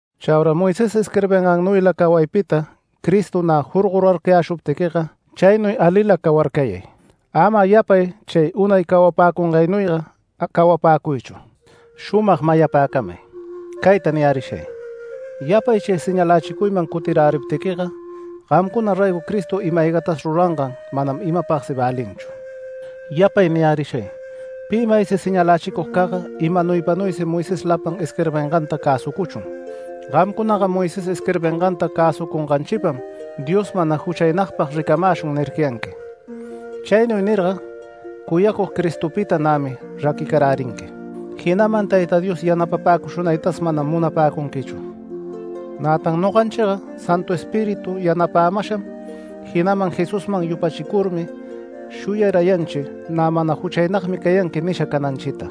Chaura Moisés isquirbingannuyla cawaypita Cristo nä jorgorarcayäshuptiquiga chaynuy alila cawarcayay. Ama yapay chay unay cawapäcungaynuyga cawapäcuychu. Shumag mayapäcamay, cayta niyärishay: Yapay chay señalächicuyman cutiräriptiquiga, gamcuna raygo Cristo ima-aygatas rurangan manam imapagsi välinchu. Yapay niyärishay: Pi maysi señalächicugcagga imanaypanuysi Moisés lapan isquirbinganta cäsucuchun. “Gamcunaga Moisés isquirbinganta cäsunganchipam, Dios mana juchaynagpag ricamäshun” nircayanquim. Chaynuy nirga cuyacug Cristopita nämi raquicarärinqui, jinaman Tayta Dios yanapapäcushunaytas manam munapäcunquichu. Nätan noganchiga Santu Espíritu yanapämasham jinaman Jesusman yupachicurmi shuyarayanchi “Nä mana juchaynagmi cayanqui” nisha cananchita.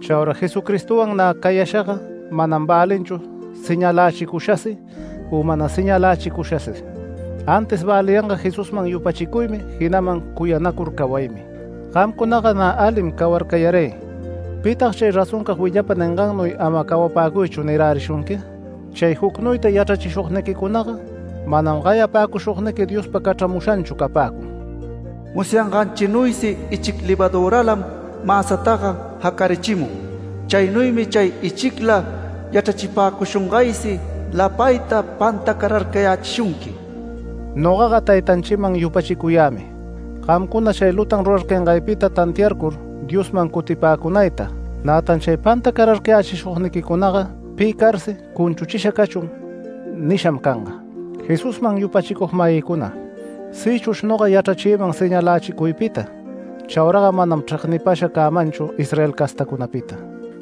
Chaura Jesucristowan nä cayashaga manam välinchu señalächicushasi u mana señalächicushasi. Antis väliyanga Jesusman yupachicuymi jinaman cuyanacur cawaymi. Gamcunaga nä alim cawarcayaray ¿pitag “Chay razoncag willapa ningannuyga ama cawapäcuychu” nirärishunqui? Chay jucnuyta yachrachishugniquicunaga manam gayapäcushugniqui Diospa cachramushanchu capäcun. Musyanganchinuysi ichic levaduralam mäsataga jacarichimun. Chaynuymi chay ichicla yachrachipäcushungaysi lapayta pantacararcayächishunqui. Nogaga taytanchiman yupachicuyämi, gamcuna chay lutan rurarcayangaypita tantiacurcur Diosman cutipäcunayta. Nätan chay pantacarcayächishugniquicunaga pi carsi “Cunchuchisha cachun” nisham canga. Jesusman yupachicug-mayïcuna, sïchush noga yachrayächïman señalächicuypita, chauraga manam chregnipasha cämanchu Israel castäcunapita.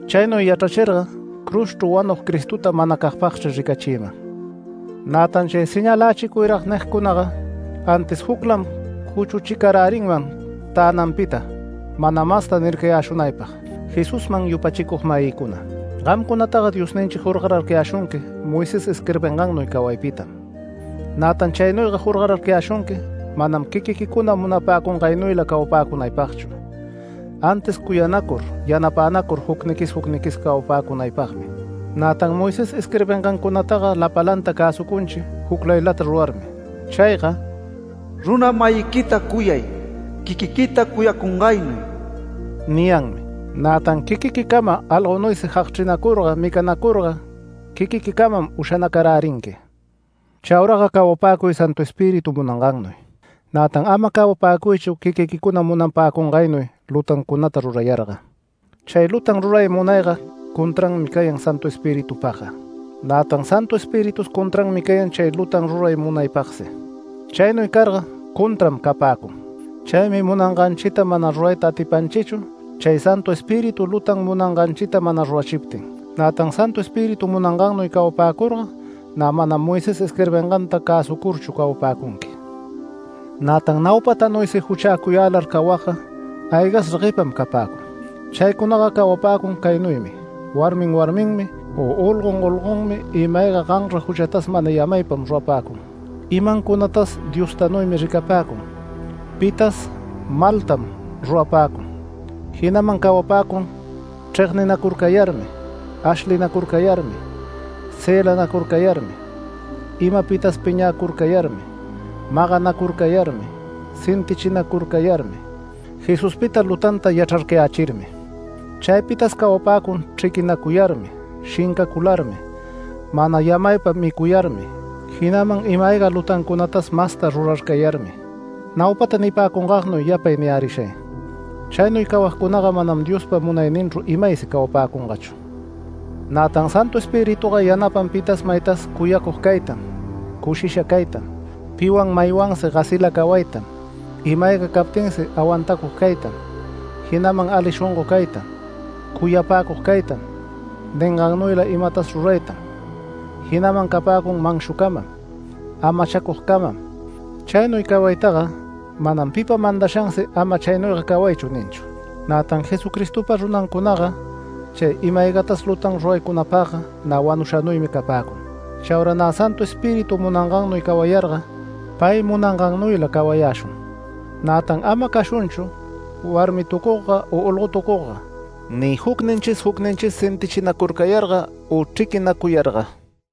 Chaynuy yachrachirga cruzchru wanug Cristota manacagpagchri ricachïman. Nätan chay “Señalächicuyrag” nigcunaga, antis juclam cuchuchicarärinman tänanpita, mana masta nircayäshunaypag. Jesusman yupachicug-mayïcuna, gamcunataga, Diosninchi jorgorarcayäshunqui Moisés isquirbingannuy cawaypitam. Nätan chaynuyga jorgorarcayäshunqui manam quiquiquicuna munapäcungaynuyla cawapäcunaypagchu, antis cuyanacur yanapänacur jucniquis jucniquis cawapäcunaypagmi. Nätan Moisés isquirbingancunataga lapalanta cäsucunchi juclaylata rurarmi. Chayga “Runa-mayiquita cuyay quiquiquita cuyacungaynuy” niyanmi. Nätan quiquiquicama algonuysi jagchrinacurga, micanacurga quiquiquicamam ushanacarärinqui. Chauraga cawapäcuy Santu Espíritu munangannuy, nätan ama cawapäcuychu quiquiquicuna munapäcungaynuy lutancunata rurayarga. Chay lutan ruray munayga contranmi cayan Santu Espiritupagga, nätan Santu Espiritus contranmi cayan chay lutan ruray munaypagsi. Chaynuy carga contram capäcun. Chaymi munanganchita mana rurayta atipanchichu chay Santu Espíritu lutan munanganchita mana rurachiptin. Nätan Santu Espíritu munangannuy cawapäcurga nä manam Moisés isquirbinganta cäsucurchu cawapäcunqui. Nätan naupatanuysi juchäcuyälar cawagga aygas regueypam capäcun. Chaycunaga cawapäcun caynuymi: warmin warminmi, u olgon olgonmi, ima-ayga ganra juchatas mana yamaypam rurapäcun. Imancunatas Diostanuymi ricapäcun, pitas maltam rurapäcun, jinaman cawapäcun, chregninacurcayarmi, ashlinacurcayarmi, cëlanacurcayarmi, imapitas piñäcurcayarmi, maganacurcayarmi, sentichinacurcayarmi, Jesuspita lutan yachrarcayächirmi. Chaypitas cawapäcun chriquicuyarmi, shincacularmi, mana yamaypa micuyarmi, jinaman ima-ayga lutancunatas masta rurarcayarmi. Naupata nipäcungagnuy yapay niyärishay: Chaynuy cawagcunaga manam Diospa munayninchru imaysi cawapäcungachu. Nätan Santu Espirituga yanapan pitas maytas cuyacug caytam, cushisha caytam, piwan maywansi gasila cawaytam, ima-ayga captinsi awantacug caytam, jinaman ali shongo caytam, cuyapäcug caytam, ningannuyla imatas ruraytam, jinaman capäcun manshucamam, amachacugcamam. Chaynuy cawaytaga manam pipa mandashansi “Ama chaynuyga cawaychu” ninchu. Nätan Jesucristopa runancunaga chay ima-aygatas lutan ruraycunapagga nä wanushanuymi capäcun. Chaura nä Santu Espíritu munangannuy cawayarga pay munangannuyla cawayäshun. Nätan ama cashunchu warmitucugga u olgotucugga, ni jucninchis jucninchis sentichinacurcayarga, u chriquinacuyarga.